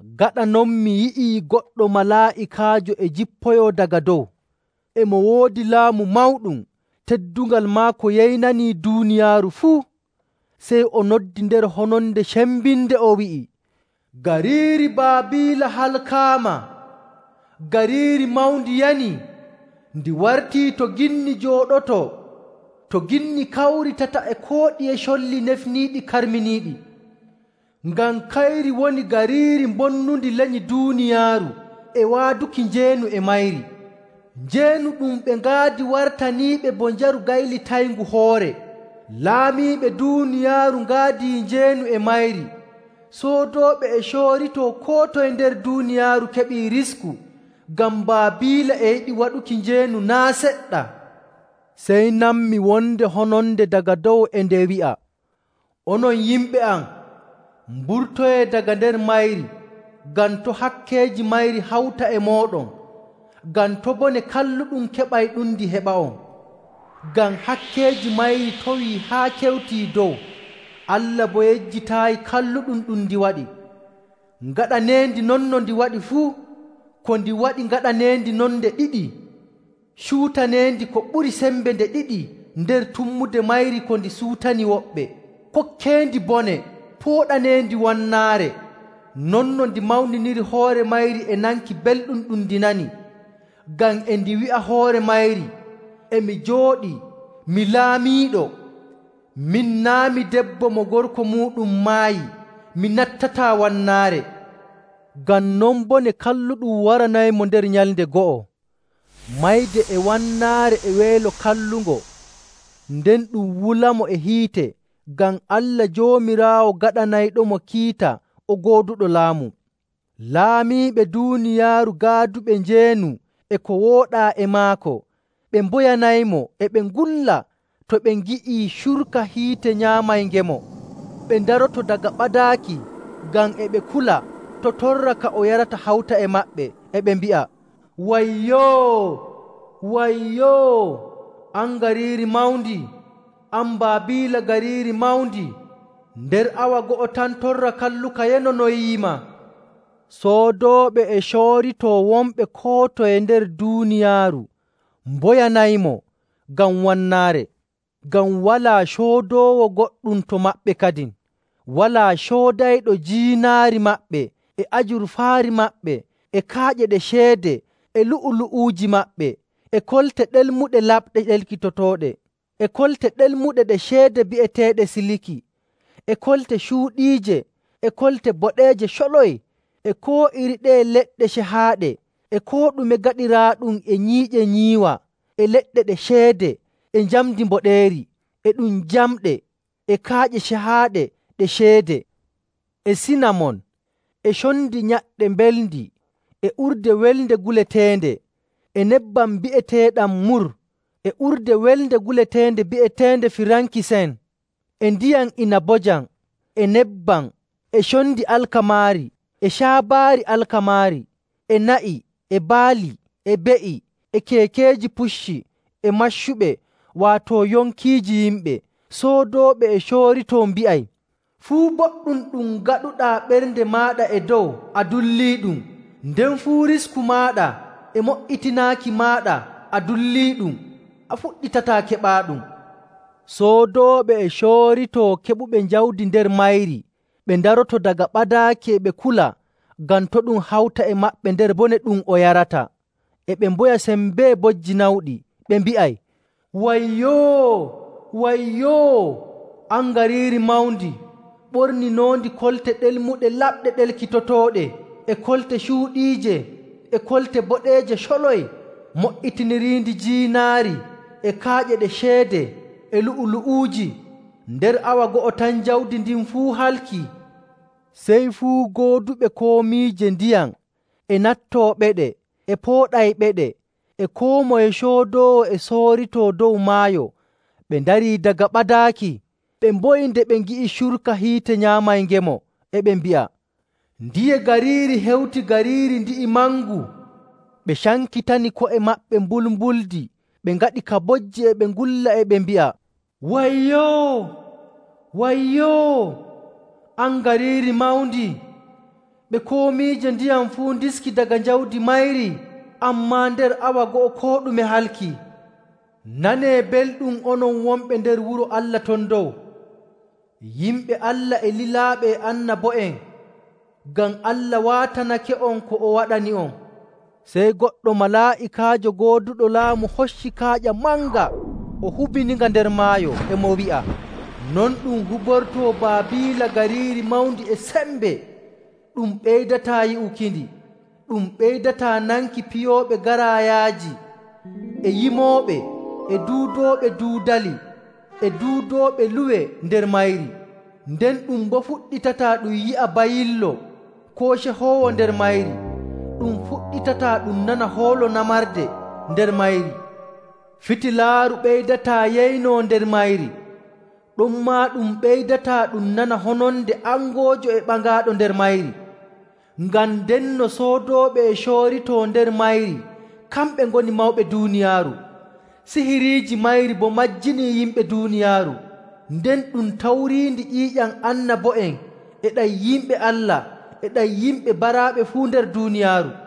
Gaɗa non mi yi'ii goɗɗo malaa'ikaajo e jippoyoo daga dow. E mo woodi laamu mawɗum teddungal maako yeynanii duuniyaaru fuu. Sey o noddi nder hononde cembinde, o wi'i, “Gariiri Baabiila halkaama! Gariiri mawndi yanii! Ndi wartii to ginni njooɗotoo, to ginni kawritata e koo ɗiye colli nefniiɗi karminiiɗi. Ngam kayri woni gariiri bonnundi lenyi duuniyaaru e waaduki njeenu e mayri. Njeenu ɗum ɓe ngaadi wartaniiɓe bo njaru gaylitayngu hoore. Laamiiɓe duuniyaaru ngaadii njeenu e mayri. Soodooɓe e cooritoo koo toye nder duuniyaaru keɓii risku ngam Baabiila e yiɗi waɗuki njeenu naa' seɗɗa.” Sey nanmi wonde hononde daga dow e nde wi'a, “Onon yimɓe am, mburtoyee daga nder mayri, ngam to' hakkeeji mayri hawta e mooɗon, ngam to' bone kalluɗum keɓayɗumndi heɓa'on. Ngam hakkeeji mayri towii haa kewtii dow; Allah boo yejjitaayi kalluɗum ɗum ndi waɗi. Ngaɗaneendi non no ndi waɗi fuu. Ko ndi waɗi, ngaɗaneendi non nde ɗiɗi. Cuutaneendi ko ɓuri sembe nde ɗiɗi nder tummude mayri ko ndi suutani woɓɓe. Kokkeendi bone pooɗaneendi wannaare, non no ndi mawniniri hoore mayri e nanki belɗum ɗum ndi nani. Ngam e ndi wi'a hoore mayri, ‘E mi jooɗii, mi laamiiɗo. Min, naa' mi debbo mo gorko muuɗum maayi, mi nattataa wannaare.’ Ngam non bone kalluɗum waranaymo nder nyalnde go'o, mayde e wannaare e weelo kallungo, nden ɗum wulamo e hiite, ngam Allah Joomiraawo gaɗanayɗomo kiita o gooduɗo laamu.” Laamiiɓe duuniyaaru gaaduɓe njeenu e ko wooɗaa e maako ɓe mboyanaymo e ɓe ngulla to ɓe ngi'ii curka hiite nyaamayngemo. Ɓe ndaroto daga ɓadaaki ngam e ɓe kula to' torra ka o yarata hawta e maɓɓe, e ɓe mbi'a, “Wayyoo! Wayyoo! An gariiri mawndi! An Baabiila gariiri mawndi! Nder awa go'o tan torra kalluka yanonoyiima.” Soodooɓe e cooritoo wonɓe koo toye nder duuniyaaru mboyanaymo ngam wannaare, ngam walaa coodoowo goɗɗum to maɓɓe kadin. Walaa coodayɗo jiinaari maɓɓe, e ajurfaari maɓɓe, e kaaƴe ɗe ceede, e lu'ulu'uuji maɓɓe, e kolte ɗelmuɗe laɓɗe ɗelkitotooɗe, e kolte ɗelmuɗe ɗe ceede bi'eteeɗe siliki, e kolte cuuɗiije, e kolte boɗeeje coloy, e koo iri ɗeye leɗɗe cehaaɗe, e koo ɗume gaɗiraaɗum e nyiiƴe nyiiwa e leɗɗe ɗe ceede, e njamndi mboɗeeri, e ɗum jamɗe, e kaaƴe cehaaɗe ɗe ceede, e sinamon, e condi nyaɗɗe mbelndi, e urde welnde guleteende, e nebbam bi'eteeɗam mur, e urde welnde guleteende bi'eteende firankisen, e ndiyam inabojam, e nebbam, e condi alkamaari, e caabaari alkamaari, e na'i, e baali, e be'i, e keekeeji pucci, e maccuɓe, waato yonkiiji yimɓe. Soodooɓe e cooritoo mbi'ay, “Fuu boɗɗum ɗum ngaɗuɗaa ɓernde maaɗa e dow a dulliiɗum. Nden fuu risku maaɗa e mo''itinaaki maaɗa a dulliiɗum, a fuɗɗitataa keɓaaɗum!” Soodooɓe e cooritoo keɓuɓe jawdi nder mayri, ɓe ndaroto daga ɓadaaki, e ɓe kula ngam to' ɗum hawta e maɓɓe nder bone ɗum o yarata, e ɓe mboya sembee, bojji nawɗi. Ɓe mbi'ay, “Wayyoo! Wayyoo! An gariiri mawndi, ɓorninoondi kolte ɗelmuɗe laɓɗe ɗelkitotooɗe, e kolte cuuɗiije, e kolte boɗeeje coloy, mo''itiniriindi jiinaari, e kaaƴe ɗe ceede, e lu'ulu'uuji! Nder awa go'o tan jawdi ndin fuu halkii!” Sey fuu gooduɓe komiije ndiyam e nattooɓeɗe e pooɗayɓeɗe, e koo moye coodoowo e sooritoo dow maayo, ɓe ndarii daga ɓadaaki, ɓe mboyi nde ɓe ngi'i curka hiite nyaamayngemo, e ɓe mbi'a, “Ndiye gariiri hewti gariiri ndi'i mangu?” Ɓe cankitani ko'e maɓɓe mbulmbuldi ɓe ngaɗi ka bojji e ɓe ngulla e ɓe mbi'a, “Wayyoo! Wayyoo! An gariiri mawndi! Ɓe komiije ndiyam fuu ndiski daga jawdi mayri! Ammaa nder awa go'o koo ɗume halkii!” Nanee belɗum onon wonɓe nder wuro Allah ton dow, yimɓe Allah e lilaaɓe e annabo'en, ngam Allah waatanake'on ko o waɗani'on! Sey goɗɗo malaa'ikaajo gooduɗo laamu hocci kaaƴa manga o hubiinga nder maayo, e mo wi'a, “Non ɗum hubortoo Baabiila gariiri mawndi e sembe, ɗum ɓeydataa yi'ukindi. Ɗum ɓeydataa nanki piyooɓe garaayaaji, e yimooɓe, e duudooɓe duudaali, e duudooɓe luwe nder mayri, nden ɗum boo fuɗɗitataa ɗum yi'a bayillo koo cehoowo nder mayri, ɗum fuɗɗitataa ɗum nana hoolo namarde nder mayri! Fitilaaru ɓeydataa yeynoo nder mayri. Ɗonmaa ɗum ɓeydataa ɗum nana hononde angoojo e ɓaŋaaɗo nder mayri. Ngam ndenno soodooɓe e cooritoo nder mayri kamɓe ngoni mawɓe duuniyaaru, sihiriiji mayri boo majjinii yimɓe duuniyaaru! Nden ɗum tawriindi ƴiiƴam annabo'en e ɗam yimɓe Allah e ɗam yimɓe baraaɓe fuu nder duuniyaaru.”